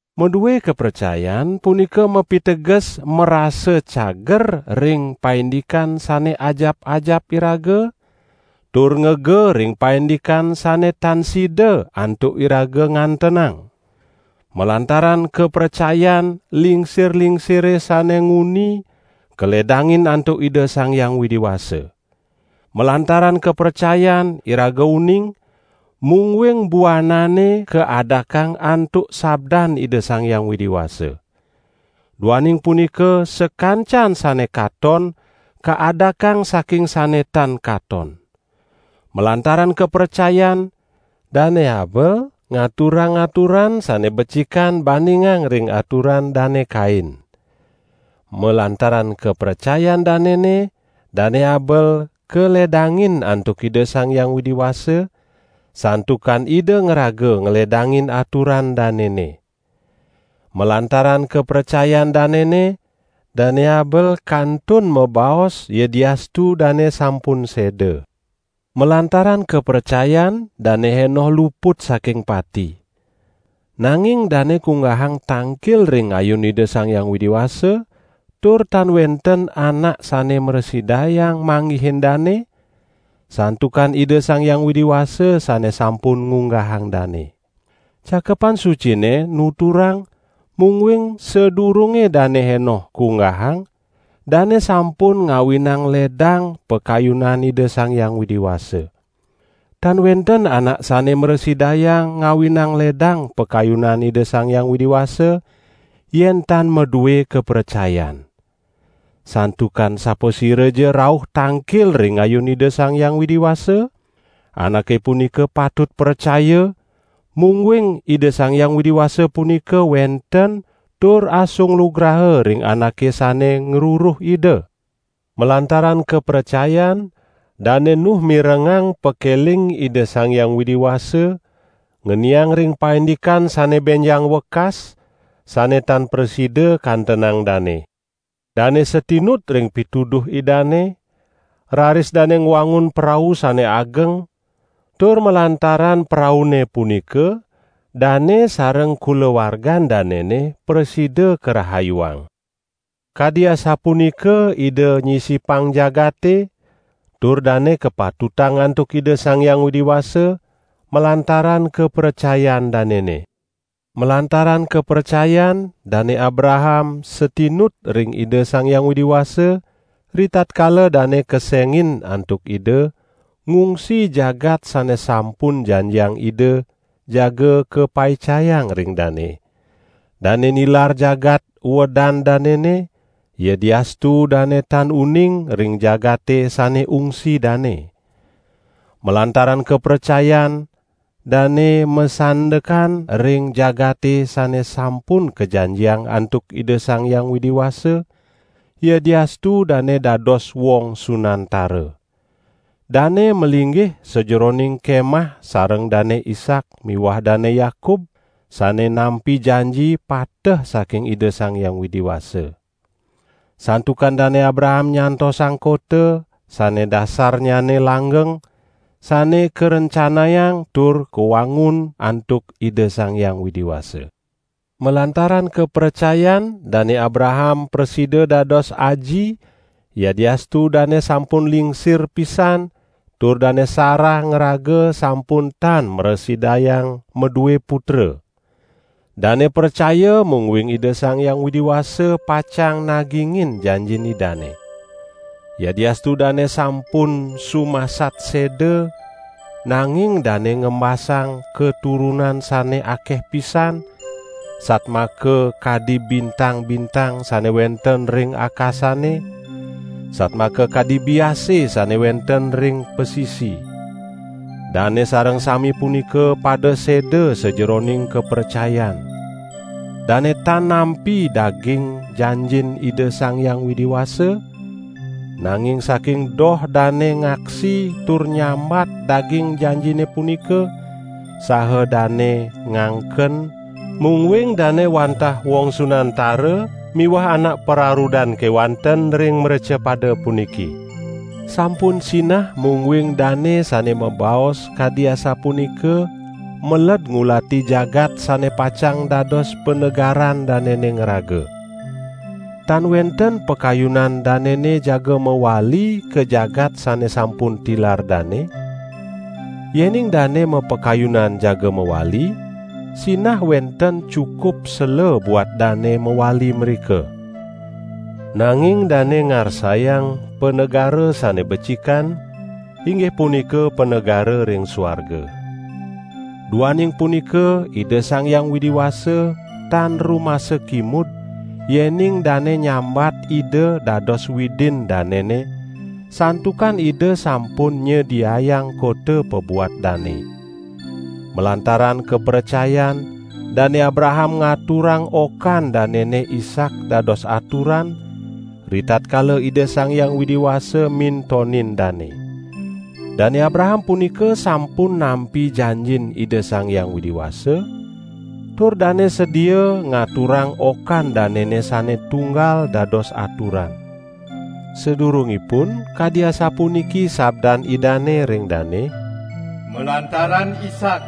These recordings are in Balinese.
Madue kapracayan punika mapiteges marasa cager ring paindikan sane ajap-ajap iraga tur ngega ring paindikan sane tan sida antuk iraga ngantenang. Malantaran kapracayan, lingsir-lingsire sane nguni kaledangin antuk Ida Sang Hyang Widi Wasa. Malantaran kapracayan, iraga uning, mungguing buanane kaadakang antuk sabdan Ida Sang Hyang Widi Wasa. Duaning punika sakancan sane katon kaadakang saking sane tan katon. Malantaran kapracayan, Dane Habel ngaturang aturan sane becikan bandingang ring aturan Dane Kain. Malantaran kapracayan danene, Dane Habel kaledangin antuk Ida Sang Hyang Widi Wasa, santukan Ida ngraga ngledangin aturan danene. Malantaran kapracayan danene, Dane Habel kantun mabaos yadiastu dane sampun seda. Malantaran kapracayan, Dane Henoh luput saking pati. Nanging dane kunggahang tangkil ring ayun Ida Sang Hyang Widi Wasa tur tan wenten anak sane mrasidayang manggihin dane, santukan Ida Sang Hyang Widi Wasa sane sampun ngunggahang dane. Cakepan Sucine nuturang, mungguing sadurunge Dane Henoh kunggahang, dane sampun ngawinang ledang pakayunan Ida Sang Hyang Widi Wasa. Tan wenten anak sane mrasidayang ngawinang ledang pakayunan Ida Sang Hyang Widi Wasa yen tan madue kapracayan. Santukan sapasiraja rauh tangkil ring ayun Ida Sang Hyang Widi Wasa, anake punika patut pracaya, mungguing Ida Sang Hyang Widi Wasa punika wenten tur asung lugraha ring anake sane ngruruh Ida. Malantaran kapracayan, Dane Nuh mirengang pakeling Ida Sang Hyang Widi Wasa ngeniang ring paindikan sane benjang wekas, sane tan prasida kantenang dane. Dane satinut ring pituduh Idane, raris dane ngwangun prau sane ageng tur malantaran praune punika dane sareng kulawargan danene prasida karahayuang. Kadi asapunika Ida nyisipang jagate, tur dane kapatutang antuk Ida Sang Hyang Widi Wasa malantaran kapracayan danene. Malantaran kapracayan, Dane Abraham satinut ring Ida Sang Hyang Widi Wasa, ritatkala dane kesengin antuk Ida, ngungsi jagat sane sampun janjiang Ida jaga kapaicayang ring dane. Dane nilar jagat uedan danene, yadiastu dane tan uning ring jagate sane ungsi dane. Malantaran kapracayan, dane masandekan ring jagate sane sampun kajanjiang antuk Ida Sang Hyang Widi Wasa, yadiastu dane dados wong sunantara. Dane malinggih sajeroning kemah sareng Dane Ishak miwah Dane Yakub, sane nampi janji pateh saking Ida Sang Hyang Widi Wasa. Santukan Dane Abraham nyantosang kota, sane dasarnyane langgeng, sane karencanayang tur kawangun, antuk Ida Sang Hyang Widi Wasa. Malantaran kapracayan, Dane Abraham prasida dados aji, yadiastu dane sampun lingsir pisan tur Dane Sarah ngraga sampun tan mrasidayang madue putra. Dane pracaya, mungguing Ida Sang Hyang Widi Wasa pacang nagingin janjin Idane. Yadiastu dane sampun sumasat seda, nanging dane ngembasang katurunan sane akeh pisan, satmaka kadi bintang-bintang sane wenten ring akasane, satmaka kadi biase sane wenten ring pasisi. Dane sareng sami punika, pada seda sajeroning kapracayan. Dane tan nampi daging janjin Ida Sang Hyang Widi Wasa, nanging saking doh dane ngaksi tur nyambat daging janjine punika saha dane ngangken, mungguing dane wantah wong sunantara miwah anak pararudan kewanten ring mrecapada puniki. Sampun sinah mungguing dane sane mabaos kadi asapunika, meled ngulati jagat sane pacang dados panegaran danene ngraga. Tan wenten pakayunan danene jaga mawali ka jagat sane sampun tilar dane; yening dane mapakayunan jaga mawali, sinah wenten cukup sela buat dane mawali mrika. Nanging dane ngarsayang panegara sane becikan, inggih punika panegara ring suarga. Duaning punika Ida Sang Hyang Widi Wasa tan rumasa kimud yening dane nyambat Ida dados Widin danene, santukan Ida sampun nyediayang kota pabuat dane. Malantaran kapracayan, Dane Abraham ngaturang okan danene Ishak dados aturan, ritatkala Ida Sang Hyang Widi Wasa mintonin dane. Dane Abraham punika sampun nampi janjin Ida Sang Hyang Widi Wasa tur dane sedia ngaturang okan danene sane tunggal dados aturan. Sadurungipun, kadi asapuniki sabdan Idane ring dane: "Malantaran Ishak,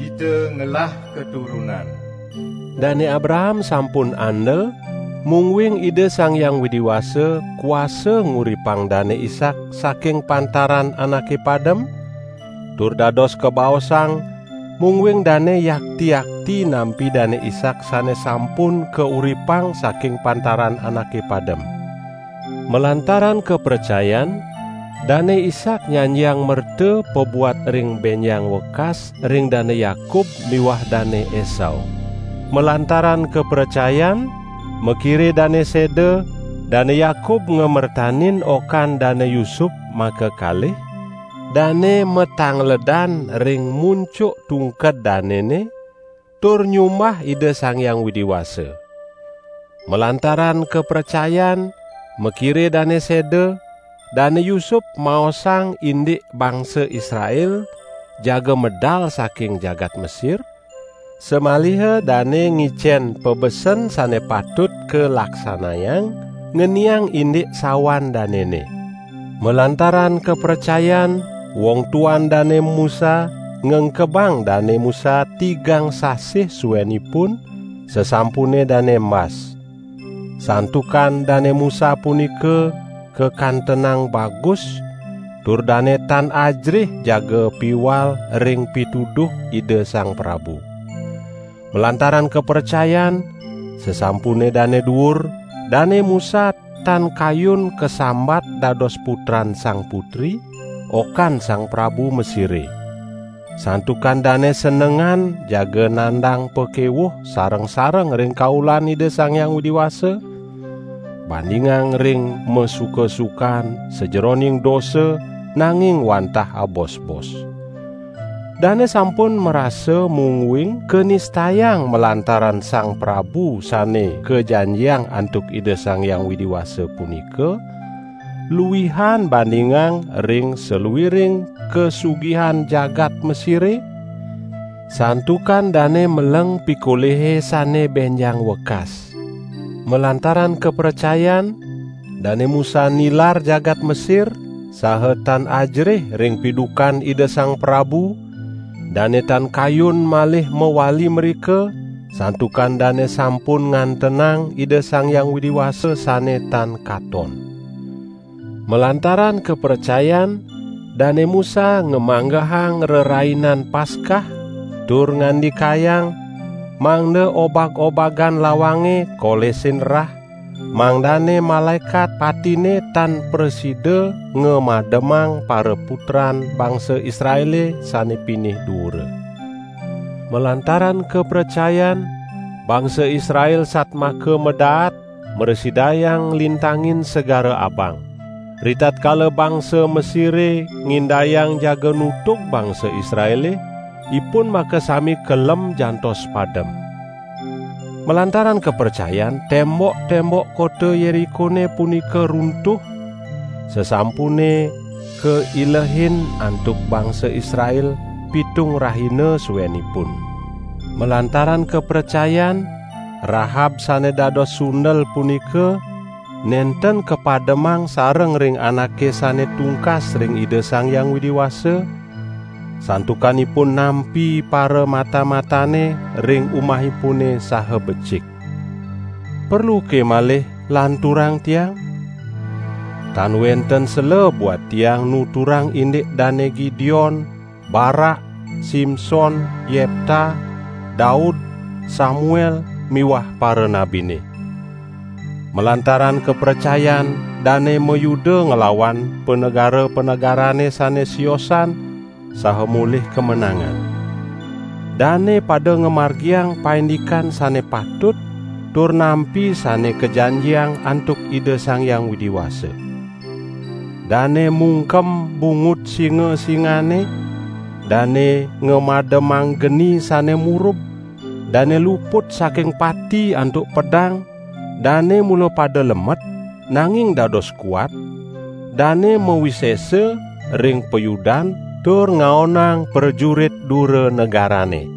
kita ngelah katurunan." Dane Abraham sampun andel, mungguing Ida Sang Hyang Widi Wasa kuasa nguripang Dane Ishak saking pantaran anake padem -- tur dados kabaosang, mungguing dane yakti-yakti nampi Dane Ishak sane sampun kauripang saking pantaran anake padem. Malantaran kapracayan, Dane Ishak nyanjiang merta pabuat ring benjang wekas ring Dane Yakub miwah Dane Esau. Malantaran kapracayan, makire dane seda, Dane Yakub ngamertanin okan Dane Yusup makakalih; dane matangledan ring muncuk tungked danene, tur nyumbah Ida Sang Hyang Widi Wasa. Malantaran kapracayan, makire dane seda, Dane Yusup maosang indik bangsa Israel jaga medal saking jagat Mesir, samaliha dane ngicen pabesen sane patut kalaksanayang ngeniang indik sawan danene. Malantaran kapracayan, wong tuan Dane Musa ngengkebang Dane Musa tigang sasih suenipun, sasampune dane embas. Santukan Dane Musa punika kakantenang bagus, tur dane tan ajerih jaga piwal ring pituduh ida sang prabu. Malantaran kapracayan, sasampune dane duur, Dane Musa, tan kayun kasambat dados putran Sang Putri, okan sang prabu Mesire. Santukan dane senengan jaga nandang pakewuh sareng-sareng ring kaulan Ida Sang Hyang Widi Wasa, bandingang ring masuka-sukan sajeroning dosa, nanging wantah abosbos. Dane sampun marasa mungguing kanistayang malantaran Sang Prabu Sane Kajanjiang antuk Ida Sang Hyang Widi Wasa punika luihan bandingang ring saluiring kasugihan jagat Mesire, santukan dane meleng pikolihe sane benjang wekas. Malantaran kapracayan, Dane Musa nilar jagat Mesir saha tan ajerih ring pidukan ida sang prabu, dane tan kayun malih mawali mrika, santukan dane sampun ngantenang Ida Sang Hyang Widi Wasa sane tan katon. Malantaran kapracayan, Dane Musa ngamanggehang Rerainan Paskah tur ngandikayang, mangda obag-obagan lawange kolesin rah, mangdane Malaekat Patine tan prasida ngamademang paraputran bangsa Israele sane pinih duura. Malantaran kapracayan, bangsa Israel satmaka madaat mrasidayang nglintangin Segara Abang. Ritatkala bangsa Mesire ngindayang jaga nutug bangsa Israele, ipun makasami kelem jantos padem. Malantaran kapracayan, tembok-tembok kota Yerikone punika runtuh, sasampune kailehin antuk bangsa Israel pitung rahina suenipun. Malantaran kapracayan, Rahab sane dados sundel punika nenten kapademang sareng ring anake sane tungkas ring Ida Sang Hyang Widi Wasa, santukan ipun nampi paramata-matane ring umahipune saha becik. Perluke malih lanturang tiang? Tan wenten sela buat tiang nuturang indik Dane Gideon, Barak, Simson, Yepta, Daud, Samuel miwah paranabine. Malantaran kapracayan, dane mayuda nglawan panegara-panegarane sane siosan saha molih kamenangan. Dane pada ngamargiang paindikan sane patut tur nampi sane kajanjiang antuk Ida Sang Hyang Widi Wasa. Dane mungkem bungut singa-singane, dane ngamademang geni sane murub, dane luput saking pati antuk pedang, dane mula pada lemet, nanging dados kuat; dane mawisesa ring payudan tur ngaonang prajurit dura negarane.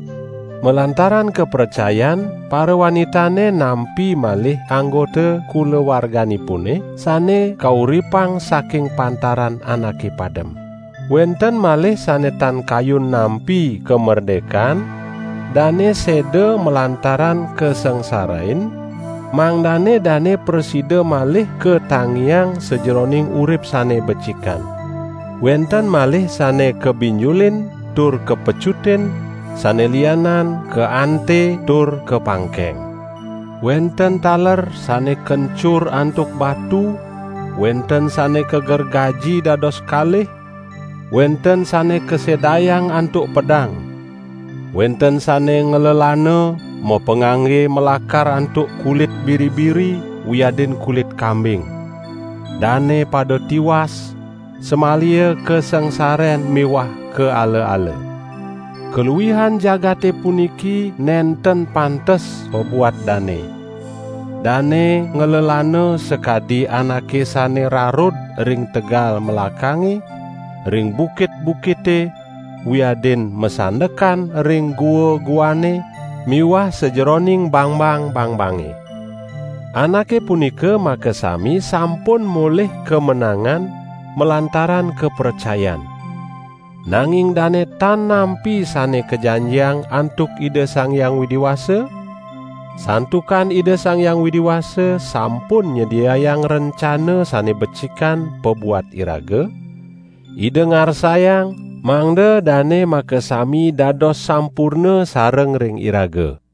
Malantaran kapracayan parawanitane nampi malih anggota kulawarganipune sane kauripang saking pantaran anake padem. Wenten malih sane tan kayun nampi kamerdekan, dane seda malantaran kasangsarain, mangdane dane prasida malih katangiang sajeroning urip sane becikan. Wenten malih sane kabinjulin tur kapecutin, sane lianan kaante tur kapangkeng. Wenten taler sane kencur antuk batu, wenten sane kagergaji dados kalih, wenten sane kasedayang antuk pedang. Wenten sane nglelana, mapangangge malakar antuk kulit biri-biri wiadin kulit kambing. Dane pada tiwas, samaliha kasangsaren miwah kaala-ala. Kaluihan jagate puniki nenten pantes pabuat dane. Dane nglelana sakadi anake sane rarud ring tegal melakange, ring bukit-bukite, wiadin masandekan ring gua-guane miwah sajeroning bangbang-bangbange. Anake punika makasami sampun molih kamenangan malantaran kapracayan. Nanging dane tan nampi sane kajanjiang antuk Ida Sang Hyang Widi Wasa, santukan Ida Sang Hyang Widi Wasa sampun nyediayang rencana sane becikan pabuat iraga; Ida ngarsayang, mangda dane makasami dados sampurna sareng ring iraga.